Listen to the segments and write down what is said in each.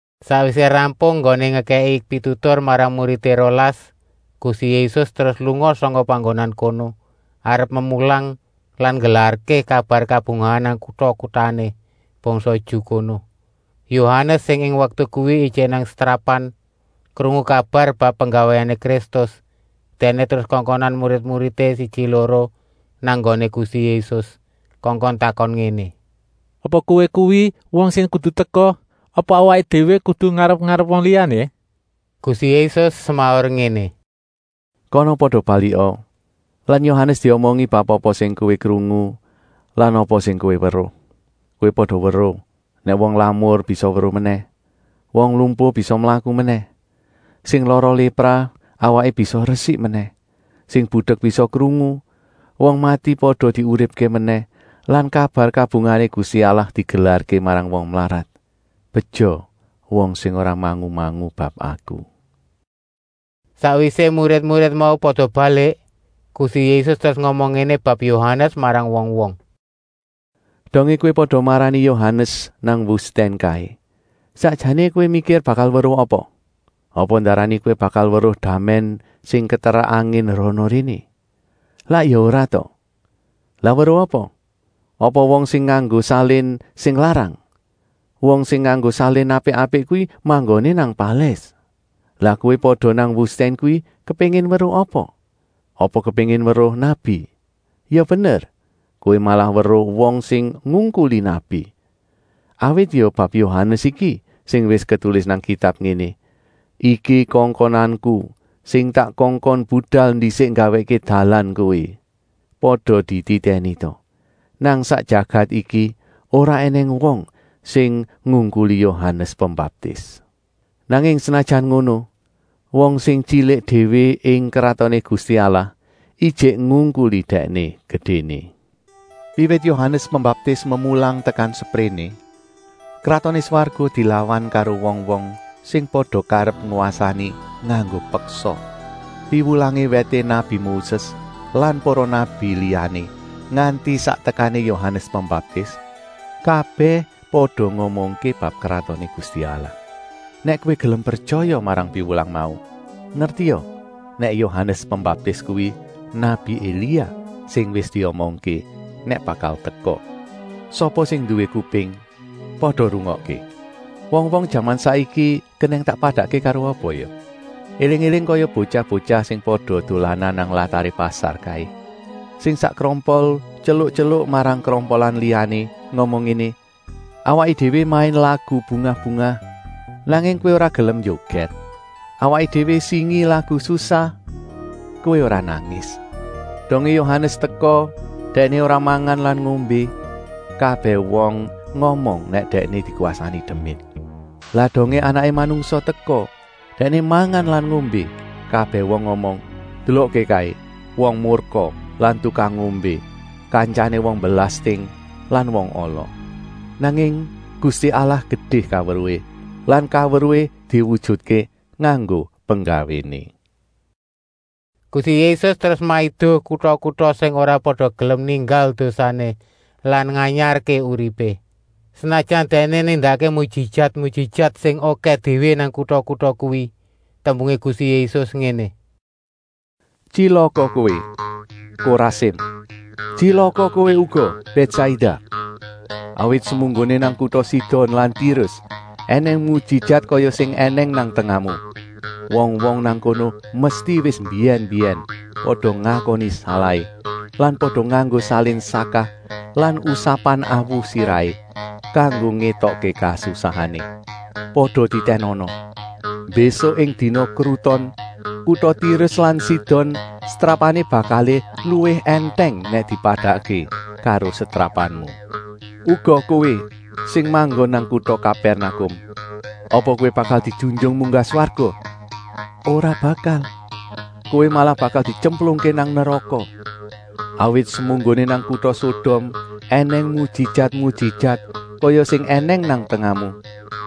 Sakwisé rampung enggoné ngekèki pitutur marang muridé rolas, Gusti Yésus terus lunga sangka panggonan kono, arep memulang lan nggelarké kabar kabungahan nang kuta-kutané bangsa Ju kono. Yohanes, sing ing waktu kuwi ijik nang setrapan, krungu kabar bab penggawéné Kristus. Dèkné terus kongkonan murid-muridé siji-loro nang nggoné Gusti Yésus, kongkon takon ngéné: “Apa Kowé kuwi wong sing kudu teka, apa awaké déwé kudu ngarep-arep wong liyané?” Gusti Yésus semaur ngéné: “Kana pada balika lan Yohanes diomongi bab apa sing kowé krungu lan apa sing kowé weruh. Kowé pada weruh nèk wong lamur bisa weruh menèh, wong lumpuh bisa mlaku menèh, sing lara lépra awaké bisa resik menèh, sing budek bisa krungu, wong mati pada diuripké menèh lan kabar kabungahané Gusti Allah digelarké marang wong mlarat. Beja wong sing ora mangu-mangu bab Aku.” Sakwisé murid-murid mau pada balik, Gusti Yésus terus ngomong ngéné bab Yohanes marang wong-wong: “Dongé kowé pada marani Yohanes nang wustèn kaé, sakjané kowé mikir bakal weruh apa? Apa ndarani kowé bakal weruh damèn sing keterak angin rana-réné? Lak ya ora ta? Lah weruh apa? Apa wong sing nganggo salin sing larang? Wong sing nganggo salin apik-apik kuwi manggoné nang palès. Lah kowé pada nang wustèn kuwi kepéngin weruh apa? Apa kepéngin weruh nabi? Ya bener, kowé malah weruh wong sing ngungkuli nabi. Awit ya bab Yohanes iki sing wis ketulis nang Kitab ngéné: ‘Iki kongkonanku, sing tak kongkon budal ndisik nggawèkké dalan kowé!’ Pada dititèni ta! Nang sak jagat iki ora ènèng wong sing ngungkuli Yohanes Pembaptis. Nanging senajan ngono, wong sing tyilik déwé ing Kratoné Gusti Allah ijik ngungkuli Dèkné gedéné. Wiwit Yohanes Pembaptis memulang tekan sepréné, Kratoné Swarga dilawan karo wong-wong sing pada karep ngwasani nganggo peksa. Piwulangé wèté nabi Moses lan para nabi liyané nganti sak tekané Yohanes Pembaptis, kabèh pada ngomongké bab Kratoné Gusti Allah. Nèk kowé gelem pretyaya marang piwulang mau, ngertia, nèk Yohanes Pembaptis kuwi nabi Elia, sing wis diomongké nèk bakal teka. Sapa sing nduwé kuping, pada rungokké. “Wong-wong jaman saiki kenèng tak padakké karo apa ya? Eling-éling kaya botyah-botyah sing pada dolanan nang lataré pasar kaé; sing sak krompol tyeluk-tyeluk marang krompolan liyané ngomong ngéné: ‘Awaké déwé main lagu bungah-bungah, nanging kowé ora gelem njogèt. Awaké déwé singi lagu susah, kowé ora nangis.’ Dongé Yohanes teka, dèkné ora mangan lan ngombé, kabèh wong ngomong nèk dèkné dikwasani demit. Lah dongé Anaké Manungsa teka, Dèkné mangan lan ngombé, kabèh wong ngomong: ‘Delokké kaé, wong murka lan tukang ngombé, kantyané wong belasting lan wong ala.’ Nanging Gusti Allah gedé kaweruhé lan kaweruhé diwujutké nganggo penggawéné.” Gusti Yésus terus maido kuta-kuta sing ora pada gelem ninggal dosané lan nganyarké uripé, senajan Dèkné nindakké mujijat-mujijat sing okèh déwé nang kuta-kuta kuwi. Tembungé Gusti Yésus ngéné: “Tyilaka kowé, Korasim! Tyilaka kowé uga, Bètsaida! Awit semunggoné nang kuta Sidon lan Tirus ènèng mujijat kaya sing ènèng nang tengahmu, wong-wong nang kono mesti wis mbiyèn-mbiyèn pada ngakoni salahé lan pada nganggo salin sakah lan usapan awu sirahé kanggo ngétokké kasusahané. Pada titènana! Mbésuk ing dina kruton kuta Tirus lan Sidon setrapané bakalé luwih èntèng nèk dipadakké karo setrapanmu. Uga kowé sing manggon nang kuta Kapèrnakum. Apa kowé bakal dijunjung munggah swarga? Ora bakal! Kowé malah bakal dityemplungké nang neraka. Awit semunggoné nang kuta Sodom ènèng mujijat-mujijat kaya sing ènèng nang tengahmu,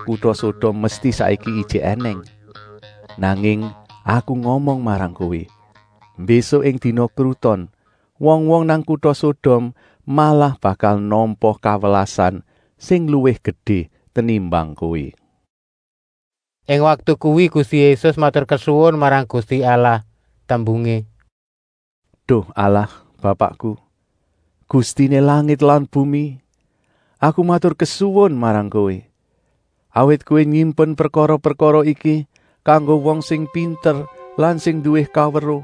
kuta Sodom mesti saiki ijik ènèng. Nanging Aku ngomong marang kowé, mbésuk ing dina kruton wong-wong nang kuta Sodom malah bakal nampa kawelasan sing luwih gedé tenimbang kowé.” Ing waktu kuwi Gusti Yésus maturkesuwun marang Gusti Allah, tembungé: “Duh Allah Bapakku, Gustiné langit lan bumi, Aku maturkesuwun marang Kowé, awit Kowé nyimpen prekara-prekara iki kanggo wong sing pinter lan sing nduwé kaweruh,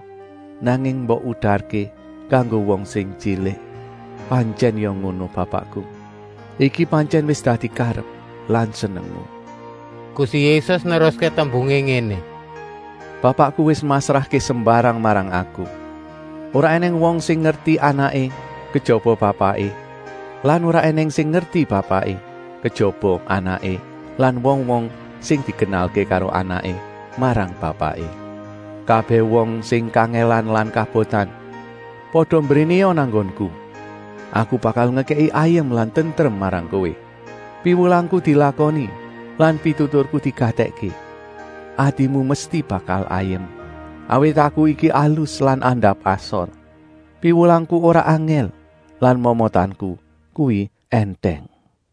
nanging mbok udarké kanggo wong sing tyilik. Pantyèn ya ngono Bapakku, iki pantyèn wis dadi karep lan senengmu.” Gusti Yésus neruské tembungé ngéné: “Bapakku wis masrahké sembarang marang Aku. Ora ènèng wong sing ngerti Anaké, kejaba Bapaké lan ora ènèng sing ngerti Bapaké, kejaba Anaké lan wong-wong sing dikenalké karo Anaké marang Bapaké. “Kabèh wong sing kangèlan lan kabotan, pada mbrénéa nang nggonku. Aku bakal ngekèki ayem lan tentrem marang kowé. Piwulangku dilakoni lan pituturku digatèkké. Atimu mesti bakal ayem, awit Aku iki alus lan andap-asor. Piwulangku ora angèl lan momotanku kuwi èntèng.”